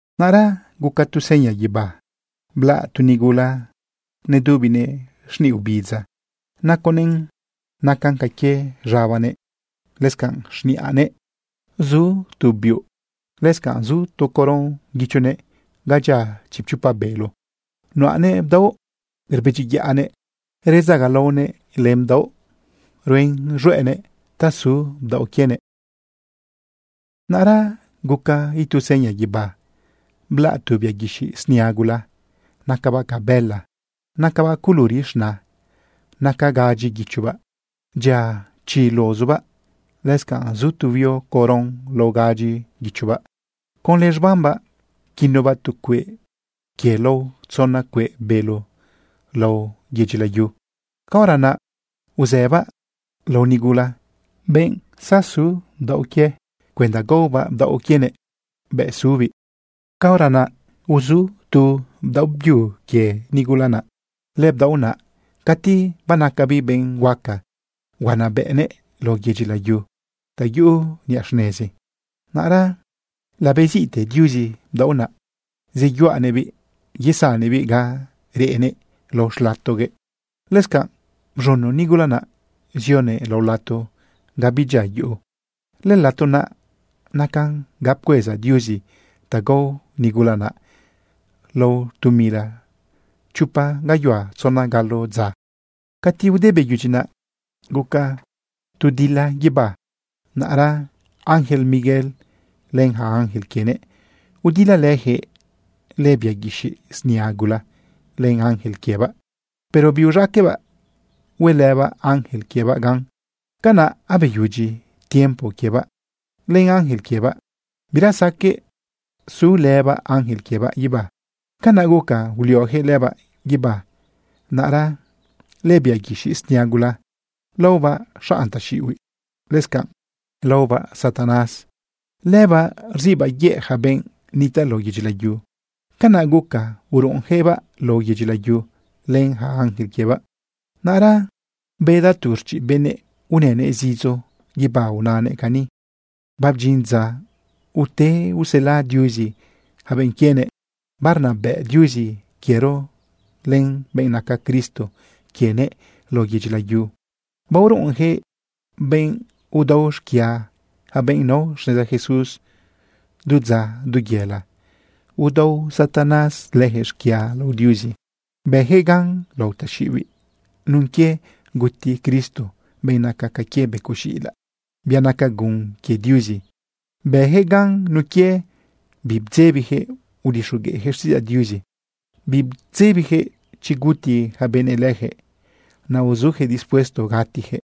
Naꞌra guca tu seña guibá. Blaꞌ tu nigula nedubinëꞌ xniꞌ ubidza. Naconëꞌn nacan ca quie z̃abanëꞌ. Lëscanꞌ xniꞌanëꞌ zu biuꞌ. Lëscanꞌ zu tu coron guichonëꞌ ga dyia chipchopa bélo. Nuꞌanëꞌ bdaoꞌ rbedyiyaꞌnëꞌ bedzagalaonëꞌ len bdaoꞌ. Ruen z̃hueꞌnëꞌ ta su bdaoꞌ quienëꞌ. Naꞌra guca itu seña guibá. Blaꞌ tu bia guixiꞌ snia gula nacabaꞌ ca bëla, nacabaꞌ culuri z̃na. Naca gadyi guichobaꞌ. Dyia chi luzubaꞌ. Lëscanꞌ zu tu huio coron lao gadyi guichobaꞌ. Conlë z̃bambaꞌ pquinobaꞌ tu cueꞌ quie lao tzona cueꞌ bélo lao yedyi layu. Caora naꞌ uzëbaꞌ lao nigula, benꞌ su bdaoꞌ quie, cuenda gaobaꞌ bdaoꞌ quienëꞌ bëꞌ subiꞌ. Caora naꞌ uzu tu bdaoꞌ byu quie nigula naꞌ. Lëbdaoꞌ naꞌ, cati banacabiꞌ benꞌ huaca, huanabëꞌnëꞌ lao yedyi layu ta yuꞌu niꞌa xnezi. Naꞌra labeziꞌte Diuzi bdaoꞌ naꞌ, zeyuꞌanëꞌbiꞌ yesannëꞌbiꞌ ga reꞌnëꞌ lao xlatoguëꞌ. Lëscanꞌ bz̃uno nigula naꞌ, zionëꞌ lao lato ga bidyia yuꞌu. Lëlato naꞌ nacan ga pcueza Diuzi ta gao nigula naꞌ lao tu mila chopa gayuhua tzona galo dza. Cati ude beyudyi naꞌ, guca tu dila guibá. Naꞌra ángel Miguel len ja ángel quienëꞌ, udilalëjëꞌ lëbia guixiꞌ snia gula len ángel quiebaꞌ. Pero biuz̃aqueꞌbaꞌ huelëbaꞌ ángel quiebaꞌ gan. Canaꞌ abeyudyi tiempo quiebaꞌ len ángel quiebaꞌ. Bira saqueꞌ sulëbaꞌ ángel quiebaꞌ guibá. Canaꞌ guca uliojëꞌ lëbaꞌ guibá. Naꞌra lëbia guixiꞌ snia gula laobaꞌ xanꞌ taxiꞌihuiꞌ. Lëscanꞌ laobaꞌ Satanás. Lëbaꞌ rziꞌbaꞌ yëꞌ ja benꞌ nitaꞌ lao yedyi layu. Canaꞌ guca uruꞌunjëꞌbaꞌ lao yedyi layu len ja ángel quiebaꞌ. Naꞌra bedaꞌ tu rchiꞌ benëꞌ unënëꞌ zidzo guibá unanëꞌ cani: ―Babdyin dza ute usela Diuzi yaca benꞌ quienëꞌ. Barnabëꞌ Diuzi quiero len benꞌ naca Cristo quienëꞌ lao yedyi layu. Baoruꞌunjëꞌ benꞌ udao xquia yaca benꞌ nao xneza Jesús. Du dza, du yela, udao Satanás lëjëꞌ xquia lao Diuzi. Bëjëꞌ gan lao taxiꞌibiꞌ nun quie guti Cristo, benꞌ naca ca quie becoꞌ z̃iꞌilaꞌ, bia naca gun quie Diuzi. Bëjëꞌ gan nun quie bibdzebijëꞌ udixogueꞌjëꞌ xtiꞌidzaꞌ Diuzi. Bibdzebijëꞌ chi guti ja benëꞌ lëjëꞌ, naꞌ uzujëꞌ dispuesto gatijëꞌ.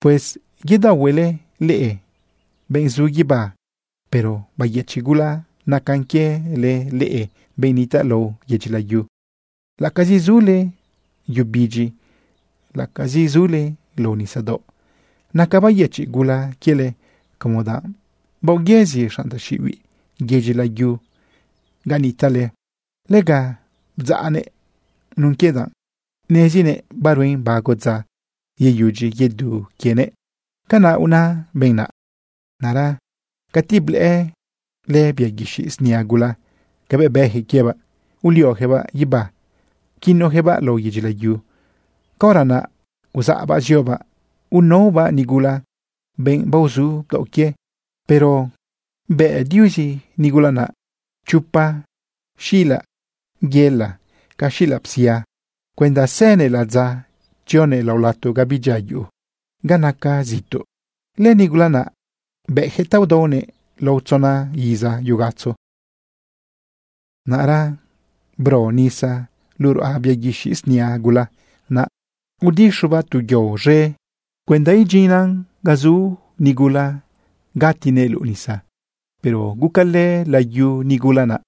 Pues yedaohuele leꞌe, benꞌ zu guibá. Pero bayëchiꞌ gula nacan quiele leꞌe, benꞌ nitaꞌ lao yedyi layu, laꞌacazi zule yu bidyi, laꞌacazi zule lao nisadaoꞌ. Naca bayëchiꞌ gula quiele como danꞌ baoyëzi xanꞌ taxiꞌibiꞌ yedyi layu ga nitaꞌle. Lega bdzaꞌnëꞌ nun quie danꞌ nezinëꞌ baruen bago dza yeyudyi yedu quienëꞌ. ―Canaꞌ una benꞌ naꞌ. Naꞌra cati blëꞌë lëbia guixiꞌ snia gula cabëꞌ bëjëꞌ quiebaꞌ, uliojëꞌbaꞌ guibá, pquinojëꞌbaꞌ lao yedyi layu, caora naꞌ uzaꞌbaꞌ ziobaꞌ unaobaꞌ nigula, benꞌ baozu bdaoꞌ quie. Pero bëꞌ Diuzi nigula naꞌ chopa xila yela ca xila psia cuenda sënëꞌ ladza tzionëꞌ lao lato ga bidyia yuꞌu, ga nacan zituꞌ. Lënigula naꞌ bëꞌjëꞌ ta udaonëꞌ lao tzona iza yugatzo. Naꞌra bro nisa luꞌu ruꞌa bia guixiꞌ snia gula naꞌ, udixobaꞌ tu yao z̃e cuenda idyinnan ga zu nigula gatinëꞌ luꞌu nisa. Pero gucalë layu nigula naꞌ,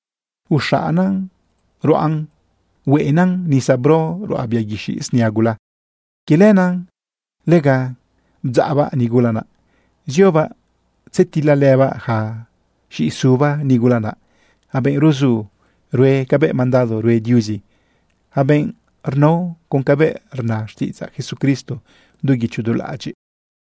uxaꞌanaꞌ ruꞌan hueꞌenan nisa bro ruꞌa bia guixiꞌ snia gula. Quie lenaꞌ lega bdzaꞌbaꞌ nigula naꞌ ziobaꞌ tzetilalëbaꞌ yaca z̃iꞌisuba nigula naꞌ, yaca benꞌ ruzu rue cabëꞌ mandado rue Diuzi, yaca benꞌ rnao con cabëꞌ rna xtiꞌidzaꞌ Jesucristo du guicho du laꞌadyiꞌ.